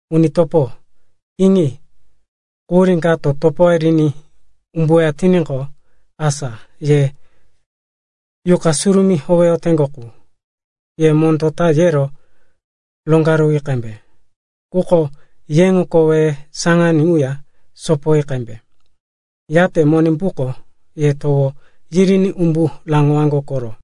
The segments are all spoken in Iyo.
Uni topo, iŋi. Quhurí kato topoye riní umbuweya tiníqo, asa ye Yuqa Surumí howeyoteŋgo qu, ye mondó ta yero roŋgaruwi qembe. Quko yeŋo koweye saŋaní ŋuya sopoyi qembe. Yate Monimbuko ye towo yiriní umbu raŋowaŋgo koro.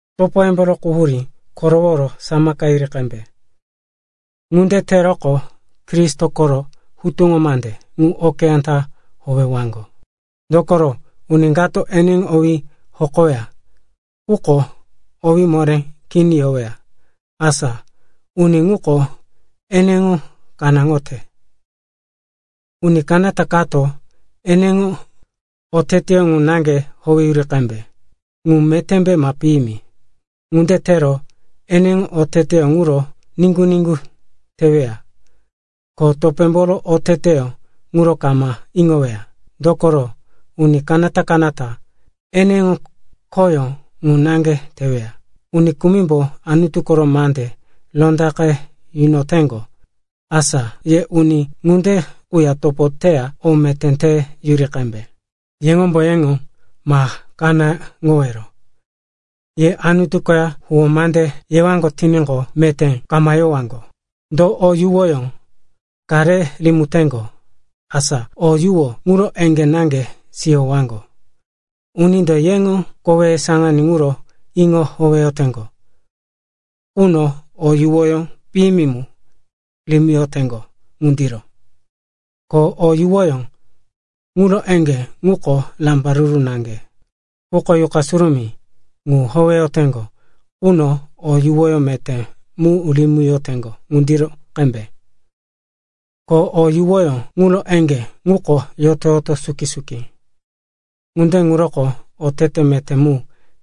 Topoyemboro quhuríye koroworo samaka yiri qembe. Ŋunde teroqo Kristo koro hutuŋo mande ŋu okeyá ta howewaŋgo. Dokoro uni kato eneŋo owí hokoweya, quko owé moré kini yoweya, asa uni ŋuko eneŋo kanáŋoyote. Uni kanata-kanatako eneŋo oteteyó ŋu naŋge towoŋoyuri qembe, ŋu metémbe ma piyimi. Ŋunde tero, eneŋo oteteyó ŋuro niŋgu-niŋgu teweya, ko topémboro oteteyó ŋuro kama iŋoweya. Dokoro, uni kanata-kanata eneŋo khoyó ŋu naŋge teweya. Uni kumimbo Anutu koro mande rondaqe yunoyoteŋgo, asa ye uni ŋunde quya topo teya o meté te yunoyi qembe. Yeŋombo yeŋo ma kanáŋowero, ye Anutu koya huwó mande yewaŋgo tiníqo, meté kama yowaŋgo. Do o yuwoyó ka re rimiteŋgo, asa o yuwoyó ŋuro eŋgé naŋge siyowaŋgo. Unindo eneŋo koweye saŋaní ŋuro iŋo howeyoteŋgo quno o yuwoyó piyimi mu rimiyoteŋgo ŋundiro. Ko o yuwoyó ŋuro eŋgé ŋuko rambaruru naŋge. Quko Yuqa Surumí ŋu howeyoteŋgo quno o yuwoyó meté mu rimiyoteŋgo ŋundiro qembe. Ko o yuwoyó ŋuro eŋgé ŋuko yoto-yoto suki-suki. Ŋunde ŋuroko otete meté mu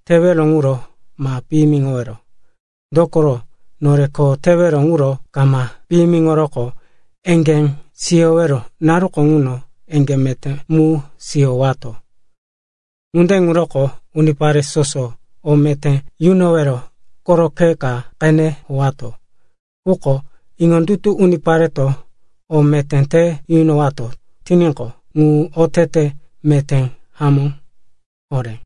tewero ŋuro ma piyimiŋowero. Dokoro nore kho tewero ŋuro kama piyimiŋoroqo, eŋgé siyowero naruko ŋuno eŋgé meté mu siyowato. Ŋunde ŋuroko unipare soso o meté te yunowero koro khe ka qene howato. Quko iŋondutu unipare o meté te yunowato tiníqo, ŋu otete meté hamó horé.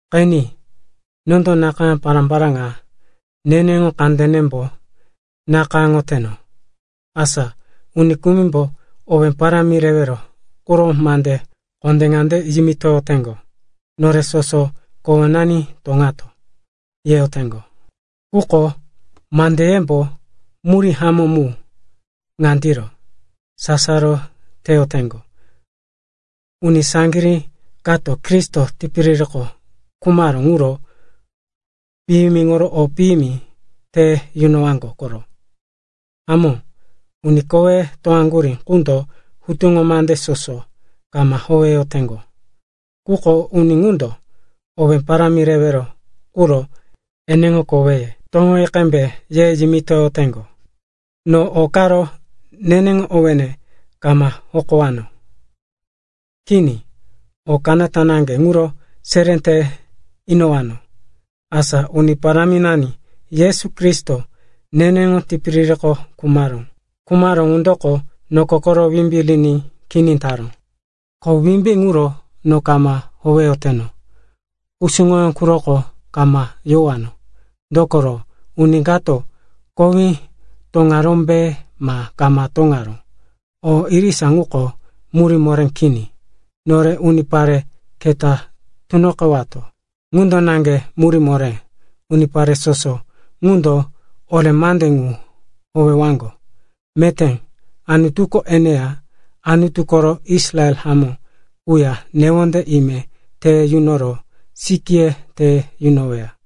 Qeni, nondo nakayá pará-pará ŋa neneŋo kandenembo nakayáŋoyoteno. Asa uni kumimbo owé parámi rewero quro mande kondé ŋande yimitoyoteŋgo, “Nore soso kowenani toŋato,” yeyoteŋgo. Quko mandeyemboro murí hamó muko ŋandiro, sasaro teyoteŋgo. Uni saŋgirí kato Kristo tipiririko khumaró ŋuro piyimiŋoro o piyimi te yunowaŋgo koro. Hamó, uni koweye toŋaŋgurí ŋundo hutuŋo mande soso kama howeyoteŋgo. Quko uni ŋundo owé parámi rewero quro yeŋo koweye toŋoyi qembe ye yimitoyoteŋgo. No o karo neneŋo owéne kama hokowano. Kini, o kanata naŋge ŋuro seré te inowano, asa Uni Paráminani Yesu Kristo neneŋo tipiririko khumaró. Khumaró ŋundoko noko koro wimbí riní kini taró. Ko wimbí ŋuro no kama howeyoteno, kusuŋoyó quroko kama yowano. Dokoro uni kato kowí toŋarómbe ma kama toŋaró, o irisa ŋuko murí moré kini. Nore unipare keta tunoqewato, ŋundo naŋge murí moré. Unipare soso ŋundo ore mande ŋu howewaŋgo, meté Anutuko eneya Anutu koro Israel hamó quya newonde ime te yunoro sikíye te yunoweya.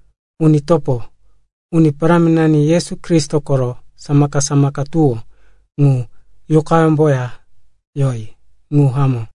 Uni topo, Uni Paráminani Yesu Kristo koro samaka-samaka tuwó ŋu yuqayemboya yoní. Ŋu hamó.